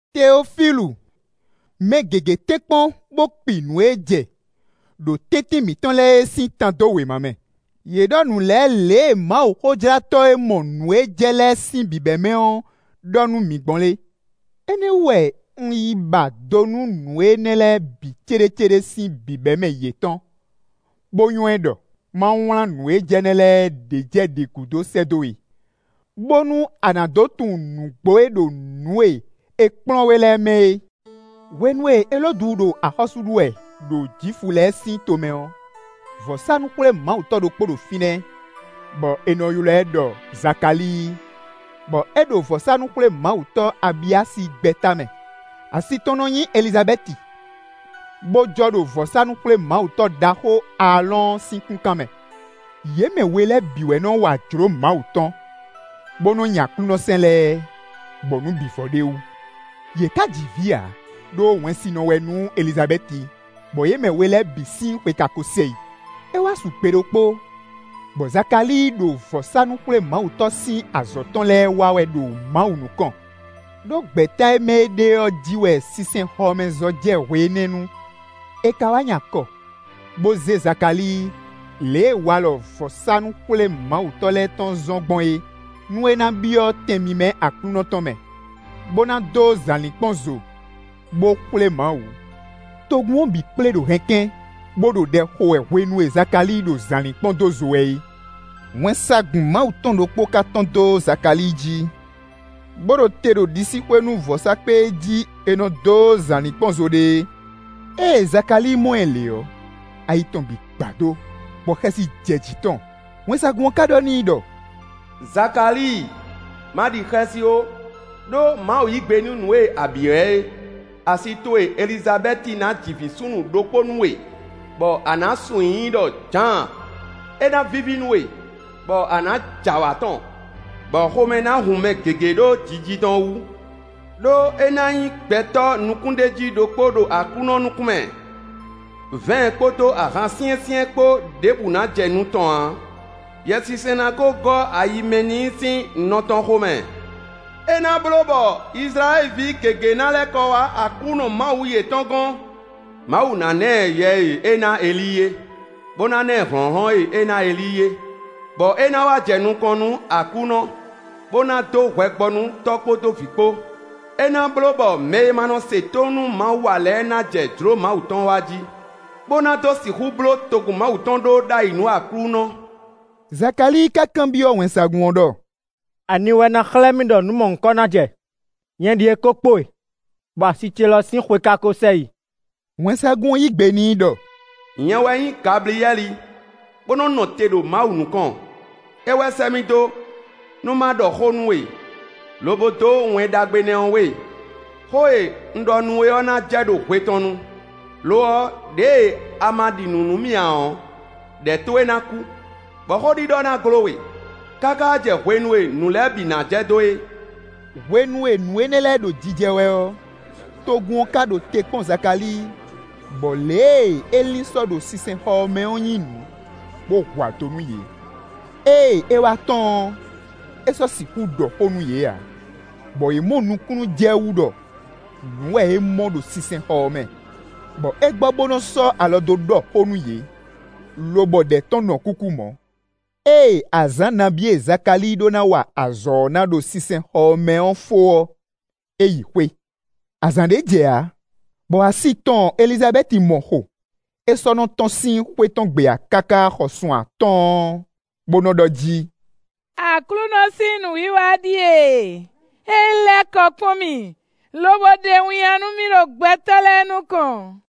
Teofílu! Mɛ gěgé tɛ́nkpɔ́n bó kpi nǔ e jɛ ɖo tɛ́ntin mǐtɔn lɛ́ɛ é sín tan dó wěma mɛ. Yě ɖɔ nǔ lɛ́ɛ lě e mawuxójlátɔ́ e mɔ nǔ e jɛ lɛ́ɛ sín bǐbɛ́mɛ ɔ́ ɖɔ nú mǐ gbɔn é. Énɛ́ wú wɛ un yi ba do nú nǔ énɛ́ lɛ́ɛ bǐ céɖécéɖé sín bǐbɛ́mɛ yětɔn, bó nywɛ́ ɖɔ má wlán nǔ e jɛ nɛ́ lɛ́ɛ ɖě jɛ ɖě gúdo sɛ́ dó we, bónú a nǎ dó tunwun nǔgbó e ɖo nǔ e è kplɔ́n we lɛ́ɛ mɛ é. Hwenu e Elódu ɖo axɔ́sú ɖu wɛ ɖo Jwifu lɛ́ɛ sín tomɛ ɔ́, vɔ̌sánú-xwlémawutɔ́ ɖokpó ɖo fínɛ́, bɔ è nɔ ylɔ́ ɛ ɖɔ Zakalíi, bɔ é ɖo vɔ̌sánú-xwlémawutɔ́ Abiya sín gbɛ̌ta mɛ. Asi tɔn nɔ nyí Elizabɛ́ti, bó jɔ ɖo vɔ̌sánú-xwlémawutɔ́ ɖaxó Aalɔ́ɔn sín kúnkan mɛ. Yě mɛ we lɛ́ɛ bǐ wɛ nɔ wa jlǒ Mawu tɔn, bó nɔ́ nyi Aklúnɔ sɛ́n lɛ́ɛ, bɔ nǔ bǐ vɔ ɖ'é wú. Yě ká ji vǐ ǎ, ɖó wɛnsinɔ wɛ nú Elizabɛ́ti, bɔ yě mɛ we lɛ́ɛ bǐ sín xwe ka ko sɛ yi. É wá su gbe ɖokpó, bɔ Zakalíi ɖo vɔ̌sánú-xwlémawutɔ́ sín azɔ̌ tɔn lɛ́ɛ wa wɛ ɖo Mawu nukɔn, ɖó gbɛ̌ta e mɛ é ɖe ɔ́ jí wɛ sinsɛnxɔmɛzɔ́ jɛ hwe énɛ́ nu. È ka wá nyi akɔ, bó zé Zakalíi lě e walɔ vɔ̌sánú-xwlémawutɔ́ lɛ́ɛ tɔn zɔ́n gbɔn é, nú é ná byɔ́ tɛn mímɛ́ Aklúnɔ tɔn mɛ, bó ná dó zǎlínkpɔ́n zo, bó xwlé Mawu. Togun ɔ́ bǐ kplé ɖo hɛnkɛ́n, bó ɖo ɖɛ xo wɛ hwenu e Zakalíi ɖo zǎlínkpɔ́n dó zo wɛ é. Wɛnsagun Mawu tɔn ɖokpó ká tɔ́n dó Zakalíi jí, bó ɖo te ɖo ɖisíxwé nú vɔ̌sákpe e jí è nɔ dó zǎlínkpɔ́n zo ɖe é. Ée Zakalíi mɔ ɛ lě ɔ́, ayi tɔn bǐ gbadó, bɔ xɛsi jɛ jǐ tɔn. Wɛnsagun ɔ́ ka ɖɔ n'i ɖɔ: “Zakalíi, ma ɖi xɛsi ó; ɖó Mawu yí gbe nú nǔ e a byɔ́ ɛ é. Asi towe Elizabɛ́ti ná ji vǐ súnnu ɖokpó nú we, bɔ a nǎ sun nyǐ i ɖɔ Jǎan. É ná víví nú we, bɔ a nǎ j'awǎ tɔn, bɔ xomɛ ná hun mɛ gěgé ɖó jiji tɔn wú. Đó é ná nyí gbɛtɔ́ nukúnɖéjí ɖokpó ɖo Aklúnɔ nukún mɛ. Vɛ̌ɛn kpódó ahan syɛ́nsyɛ́n kpó ɖěbǔ ná jɛ nu tɔn ǎ. Yɛsinsɛn ná kó gɔ́ ayi mɛ n'i sín nɔ tɔn xomɛ. É ná bló bɔ Izlayɛ́li ví gěgé ná lɛ́ kɔ wá Aklúnɔ Mawu yětɔn gɔ́n. Mawu ná ná ɛ Yɛ e é ná Elíi é, bó ná lɛ́ ná ɛ hlɔ̌nhlɔ́n e é ná Elíi é, bɔ é ná wá jɛ nukɔn nú Aklúnɔ bó ná dó hwɛ gbɔ nú tɔ́ kpódó vǐ kpó. É ná bló bɔ mɛ e ma nɔ se tónú nú Mawu ǎ lɛ́ɛ ná jɛ jlǒ Mawu tɔn wa jí, bó ná dó sixú bló togun Mawu tɔn ɖó ɖ'ayǐ nú Aklúnɔ.” Zakalíi ka kanbyɔ́ wɛnsagun ɔ́ ɖɔ: “Ani wɛ ná xlɛ́ mì ɖɔ nǔ mɔ̌hunkɔ ná jɛ? Nyɛ ɖíe kó kpo e, bɔ asi ce lɔ sín xwe ka ko sɛ yi.” Wɛnsagun ɔ́ yí gbe n'i ɖɔ: “Nyɛ wɛ nyí Gabliyɛ́li, bó nɔ́ nɔ te ɖo Mawu nukɔn. É wɛ sɛ́ mì dó, nú má ɖɔ xó nú we, lobo dó Wɛn Ɖagbe énɛ́ we. Xó e un ɖɔ nú we ɔ́ ná jɛ ɖo hwe tɔn nu. Lo ɔ́, ɖěe a ma ɖi nǔ nú mì ǎ ɔ́, ɖɛ̌ towe ná kú, bɔ xó ɖiɖɔ ná gló we, káká jɛ hwenu e nǔ lɛ́ɛ bǐ ná jɛ dó é.” Hwenu e nǔ énɛ́ lɛ́ɛ ɖo jijɛ wɛ ɔ́, togun ɔ́ ka ɖo te kpɔ́n Zakalíi, bɔ lě e é lin sɔ ɖo sinsɛnxɔ ɔ́ mɛ ɔ́ nyí nǔ, bó hu ado nú yě. Ée é wá tɔ́n ɔ́, é sɔ́ sixú ɖɔ xó nú yě ǎ, bɔ yě mɔ nukúnnú jɛ wú ɖɔ nǔ wɛ é mɔ ɖo sinsɛnxɔ ɔ́ mɛ, bɔ é gbɔ bó nɔ́ sɔ́ alɔ dó ɖɔ xó nú yě, lobɔ ɖɛ̌ tɔn nɔ kúkú mɔ̌. Ée azǎn nabí e Zakalíi ɖó ná wa azɔ̌ ɔ́ ná ɖo sinsɛnxɔ ɔ́ mɛ ɔ́ fó ɔ́, é yi xwé. Azǎn ɖé jɛ ǎ, bɔ asi tɔn Elizabɛ́ti mɔ xo; é sɔ́ nɔ́ tɔ́n sín xwé tɔn gbe ǎ káká xɔ sun atɔ́ɔ́n, bó nɔ́ ɖɔ jí: “Aklúnɔ sín nǔwiwa ɖíe; é lɛ́ kɔ kpɔ́n mì, lobo ɖe winnyá nú mì ɖo gbɛtɔ́ lɛ́ɛ nukɔn.”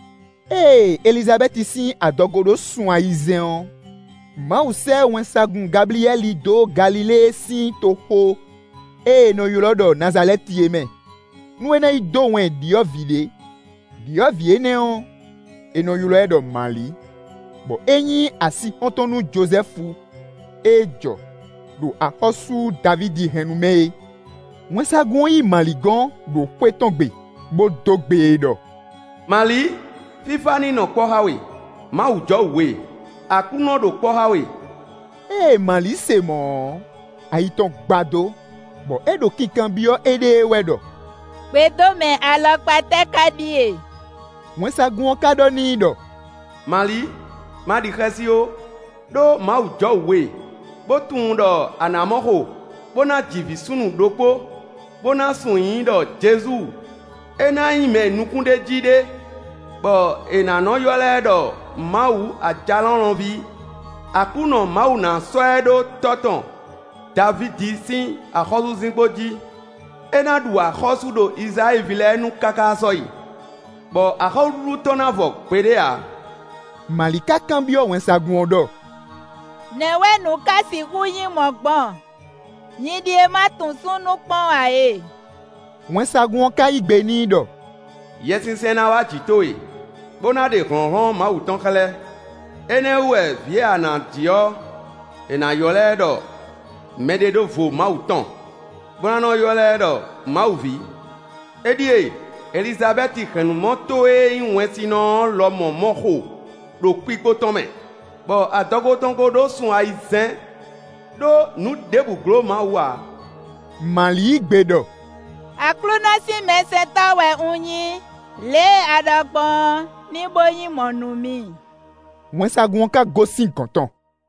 Ée Elizabɛ́ti sín adɔgo ɖó sun ayizɛ́n ɔ́, Mawu sɛ́ wɛnsagun Gabliyɛ́li dó Galilée sín toxo e è nɔ ylɔ́ ɖɔ Nazalɛ́ti é mɛ, nú é ná yi dó wɛn ɖyɔ̌vǐ ɖé. Đyɔ̌vǐ énɛ́ ɔ́, è nɔ ylɔ́ ɛ ɖɔ Mali, bɔ é nyí asixɔ́ntɔn nú Jozɛ́fu e jɔ ɖo axɔ́sú Davídi hɛ́nnu mɛ é. Wɛnsagun ɔ́ yi Mali gɔ́n, ɖo xwé tɔn gbe, bó dó gbe e ɖɔ: “Mali, fífá ní nɔ kpɔ́ xá we. Mawu jɔwǔ we; Aklúnɔ ɖo kpɔ́ xá we.” Ée Mali se mɔ̌ ɔ́, ayi tɔn gbadó, bɔ é ɖo kinkanbyɔ́ éɖée wɛ ɖɔ: “Gbedómɛ alɔkpa tɛ́ ká ɖíe?” Wɛnsagun ɔ́ ká ɖɔ n'i ɖɔ: “Mali, ma ɖi xɛsi ó; ɖó Mawu jɔwǔ we; bo tunwun ɖɔ a nǎ mɔ xo, bó ná ji vǐ súnnu ɖokpó, bó ná sun nyǐ i ɖɔ Jezu. É ná nyí mɛ nukúnɖéjí ɖé, bɔ è nǎ nɔ́ ylɔ́ ɛ ɖɔ Mawu Ajalɔ̌nlɔn ví. Aklúnɔ Mawu ná sɔ́ ɛ ɖó tɔ́ tɔn Davídi sín axɔ́súzinkpo jí. É ná ɖu axɔ́sú ɖo Izlayɛ́li ví lɛ́ɛ nu káká sɔ́yi, bɔ axɔ́súɖuɖu tɔn ná vɔ gbeɖé ǎ.” Mali ká kanbyɔ́ wɛnsagun ɔ́ ɖɔ: “Nɛ̌ wɛ nǔ ká sixú nyí mɔ̌ gbɔn? Nyi ɖíe ma tunwun súnnu kpɔ́n ǎ e.” Wɛnsagun ɔ́ ká yí gbe n'i ɖɔ: “Yɛsinsɛn ná wá jǐ towe, bó ná ɖe hlɔ̌nhlɔ́n Mawu tɔn xlɛ́; énɛ́ ɔ́ wú wɛ vǐ e a nǎ ji ɔ́, è nǎ nɔ́ ylɔ́ ɛ ɖɔ mɛɖeɖóvo Mawu tɔn, bó ná nɔ́ ylɔ́ ɛ ɖɔ Mawu ví. Éɖíe! Elizabɛ́ti hɛ̌nnumɔ towe e nyí wɛnsinɔ ɔ́ lɔmɔ̌ mɔ xo ɖo kpikpo tɔn mɛ, bɔ adɔgo tɔn ko ɖó sun ayizɛ́n. Đó nǔ ɖěbǔ gló Mawu ǎ.” Mali yí gbe ɖɔ: “Aklúnɔ sín mɛsɛntɔ́ wɛ un nyí; lě e a ɖɔ gbɔn ɔ́, ní bó nyí mɔ̌ nú mì.” Wɛnsagun ɔ́ ká gosín gɔ̌n tɔn.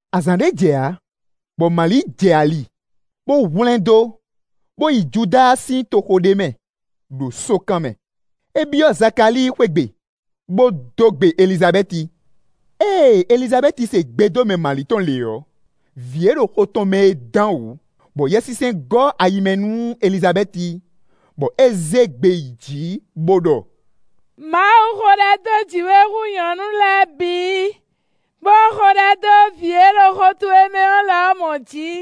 Azǎn ɖé jɛ ǎ, bɔ Mali jɛ ali, bó hwlɛ́ndó, bó yi Judáa sín toxo ɖé mɛ, ɖo sókan mɛ. É byɔ́ Zakalíi xwé gbe, bó dó gbe Elizabɛ́ti. Ée Elizabɛ́ti se gbedómɛ Mali tɔn lě ɔ́, vǐ e ɖo xo tɔn mɛ é dán wǔ, bɔ Yɛsinsɛn gɔ́ ayi mɛ nú Elizabɛ́ti, bɔ é zé gbe yi jǐ, bó ɖɔ: “Mawu xo ɖɛ dó jǐ we hú nyɔ̌nu lɛ́ɛ bǐ, bó xo ɖɛ dó vǐ e ɖo xo towe mɛ é lɔmɔ̌ jí.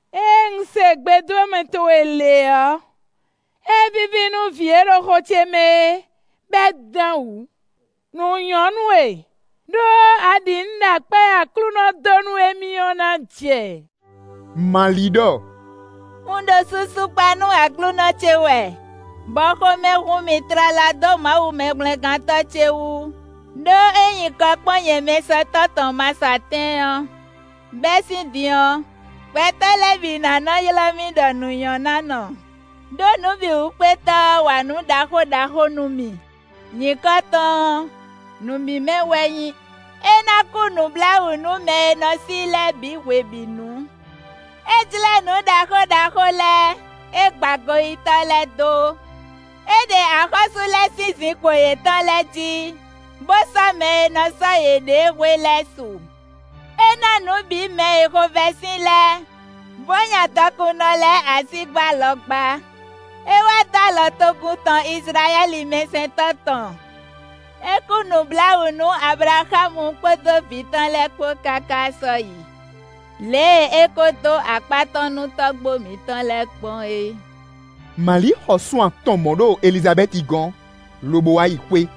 Ée un se gbedómɛ towe lě ɔ́, é víví nú vǐ e ɖo xo ce mɛ é, bɔ é dán wǔ. Nǔ nyɔ́ nú we, ɖó a ɖi nǔ ɖɔ akpá e Aklúnɔ dó nú émí ɔ́ ná jɛ.” Mali ɖɔ: “Un ɖo susu kpa nú Aklúnɔ ce wɛ, bɔ xomɛ hun mì tlala dó Mawu Mɛhwlɛ́ngántɔ́ ce wu; ɖó é nyi kɔ kpɔ́n nyɛ mɛsɛntɔ́ tɔn masɔatɛ́n ɔ́. Bɛ́ sín din ɔ́, gbɛtɔ́ lɛ́ɛ bǐ ná nɔ́ ylɔ́ mì ɖɔ nǔnyɔ́nánɔ, ɖó Nǔbǐwúkpétɔ́ ɔ́ wa nǔ ɖaxó ɖaxó nú mì. Nyǐkɔ tɔn ɔ́, nǔ mímɛ́ wɛ é nyí. É ná kú nǔbláwǔ nú mɛ e nɔ sí i lɛ́ɛ bǐ hwebǐnu. É jlɛ́ nǔ ɖaxó ɖaxó lɛ́ɛ; é gba goyítɔ́ lɛ́ɛ dó. É ɖe axɔ́sú lɛ́ɛ sín zinkpo yětɔn lɛ́ɛ jí, bó sɔ́ mɛ e nɔ sɔ́ yěɖée hwe lɛ́ɛ su. É ná nǔ bǐ mɛ e xovɛ́ sin lɛ́ɛ, bó nya dɔkunnɔ lɛ́ɛ asígbá alɔgbá. É wá dó alɔ togun tɔn Izlayɛ́li mɛsɛntɔ́ tɔn; é kú nǔbláwǔ nú Ablaxámu kpódó vǐ tɔn lɛ́ɛ kpó káká sɔ́yi, lě e é kó dó akpá tɔn nú tɔ́gbó mǐtɔn lɛ́ɛ gbɔn é.” Mali xɔ sun atɔn mɔ̌ ɖo Elizabɛ́ti gɔ́n, lobo wá yi xwé.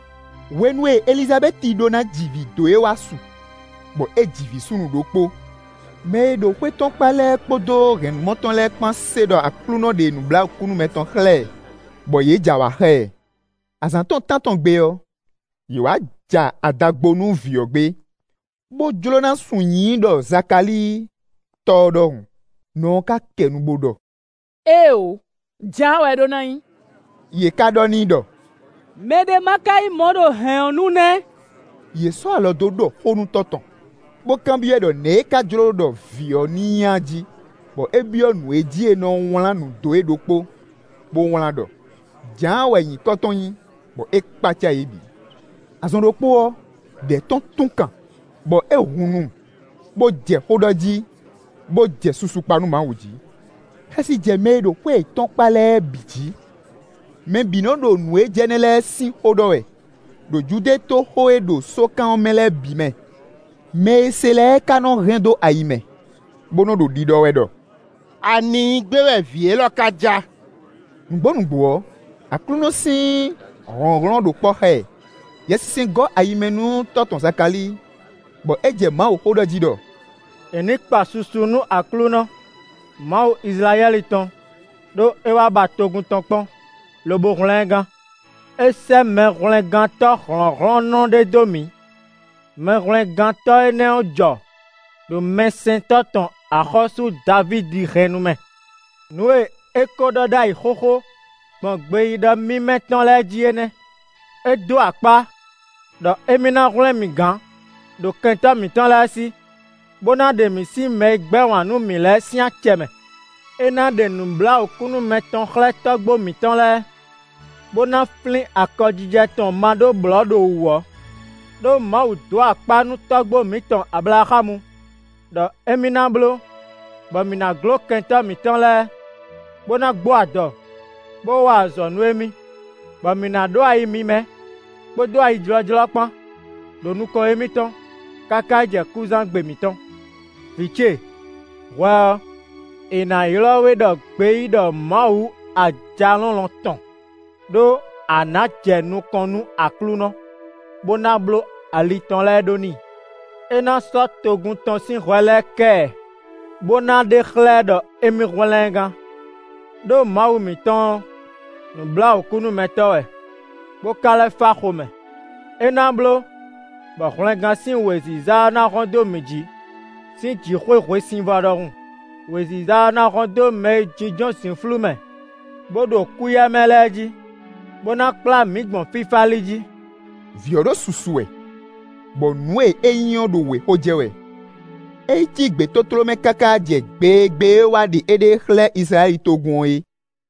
Hwenu e Elizabɛ́ti ɖó ná ji vǐ dó é wá su, bɔ é ji vǐ súnnu ɖokpó. Mɛ e ɖo xwé tɔn kpá lɛ́ɛ kpódó hɛ̌nnumɔ tɔn lɛ́ɛ kpán se ɖɔ Aklúnɔ ɖe nǔbláwǔkúnúmɛ tɔn xlɛ́ ɛ, bɔ yě j'awǎ xá ɛ. Azǎn tɔn tántɔn gbe ɔ́, yě wá ja ada gbo nú vǐ ɔ́ gbé, bó jló ná sun nyǐ i ɖɔ Zakalíi tɔ́ ɔ́ ɖɔhun. Nɔ ɔ́ ká kɛ nu, bó ɖɔ: “Éeǒ! Jǎan wɛ é ɖó ná nyí.” Yě ká ɖɔ n'i ɖɔ: “Mɛ ɖé má ká nyí mɔ̌ ɖo hɛ̌n ɔ́ nu nɛ́!” Yě sɔ́ alɔ dó ɖɔ xó nú tɔ́ tɔn, bó kanbyɔ́ ɛ ɖɔ nɛ̌ é ká jló ɖɔ vǐ ɔ́ ní nyí a jí, bɔ é byɔ́ nǔ e jí è nɔ wlán nǔ dó é ɖokpó, bó wlán ɖɔ: “Jǎan wɛ nyǐkɔ tɔn nyí.” Bɔ é kpácá yě bǐ. Azɔn ɖokpó ɔ́, ɖɛ̌ tɔn tún kan, bɔ é hun nu, bó jɛ xó ɖɔ jí, bó jɛ susu kpa nú Mawu jí. Xɛsi jɛ mɛ e ɖo xwé yětɔn kpá lɛ́ɛ bǐ jí. Mɛ bǐ nɔ́ ɖo nǔ e jɛ nɛ́ lɛ́ɛ sín xó ɖɔ wɛ ɖo Judée toxo e ɖo sókan ɔ́ mɛ lɛ́ɛ bǐ mɛ. Mɛ e se lɛ́ɛ ká nɔ́ hɛn dó ayi mɛ, bó nɔ́ ɖo ɖiɖɔ wɛ ɖɔ: “Ani nyí gbé wɛ vǐ élɔ́ ká ja?” Nǔgbó nǔgbó ɔ́, Aklúnɔ sín hlɔ̌nhlɔ́n ɖo kpɔ́ xá ɛ. Yɛsinsɛn gɔ́ ayi mɛ nú tɔ́ tɔn Zakalíi, bɔ é jɛ Mawuxó ɖɔ jí ɖɔ: “È nǐ kpa susu nú Aklúnɔ, Mawu Izlayɛ́li tɔn, ɖó é wá ba togun tɔn kpɔ́n, lobo hwlɛ́n ɛ gán. É sɛ́ Mɛhwlɛ́ngántɔ́ hlɔ̌nhlɔ́nnɔ ɖé dó mǐ. Mɛhwlɛ́ngántɔ́ énɛ́ jɔ ɖo mɛsɛntɔ́ tɔn axɔ́sú Davídi hɛ́nnu mɛ. Nǔ e é ko ɖɔ ɖ'ayǐ xóxó, gbɔn gbeyíɖɔ mímɛ́ tɔn lɛ́ɛ jí é nɛ́. É dó akpá, ɖɔ émí ná hwlɛ́n mǐ gán ɖo kɛntɔ́ mǐtɔn lɛ́ɛ sí, bó ná ɖe mǐ sín mɛ e gbɛ́ wǎn nú mǐ lɛ́ɛ sín acɛ mɛ. É ná ɖe nǔbláwǔkúnúmɛ tɔn xlɛ́ tɔ́gbó mǐtɔn lɛ́ɛ, bó ná flín akɔjijɛ tɔn ma ɖó blɔ̌ ɖo wǔ ɔ́. Đó Mawu dó akpá nú tɔ́gbó mǐtɔn Ablaxámu, ɖɔ émí ná bló, bɔ mǐ ná gló kɛntɔ́ mǐtɔn lɛ́ɛ, bó ná gbó adɔ, bó wa azɔ̌ nú émí; bɔ mǐ ná ɖó ayi mímɛ́ kpódó ayijlɔ́jlɔ́ kpán, ɖo nukɔn émítɔn, káká yi jɛ kúzán gbe mǐtɔn. Vǐ ce, hwɛ ɔ́, è nǎ ylɔ́ we ɖɔ gbeyíɖɔ Mawu Ajalɔ̌nlɔn tɔn, ɖó a nǎ jɛ nukɔn nú Aklúnɔ, bó ná bló ali tɔn lɛ́ɛ ɖó n'i. É ná sɔ́ togun tɔn sín hwɛ lɛ́ɛ kɛ ɛ, bó ná ɖe xlɛ́ ɛ ɖɔ émí hwlɛ́n ɛ gán. Đó Mawu mǐtɔn ɔ́, nǔbláwǔkúnúmɛtɔ́ wɛ, bó ká lɛ́ fá xomɛ; é ná bló bɔ hwlɛngán sín wěziza ɔ́ ná hɔ́n dó mǐ jí sín jǐxwé hwesivɔ́ ɖɔhun; wěziza énɛ́ ɔ́ ná hɔ́n dó mɛ e jínjɔ́n zǐnflú mɛ, bó ɖo kúyɛmɛ lɛ́ɛ jí, bó ná kplá mǐ gbɔn fífá li jí.” Vǐ ɔ́ ɖo susu wɛ, bɔ nǔ e é nyí ɔ́ ɖo wěxo jɛ wɛ. É yi cí gbětótló mɛ káká jɛ gbe e gbe é wá ɖe éɖée xlɛ́ Izlayɛ́li togun ɔ́ é.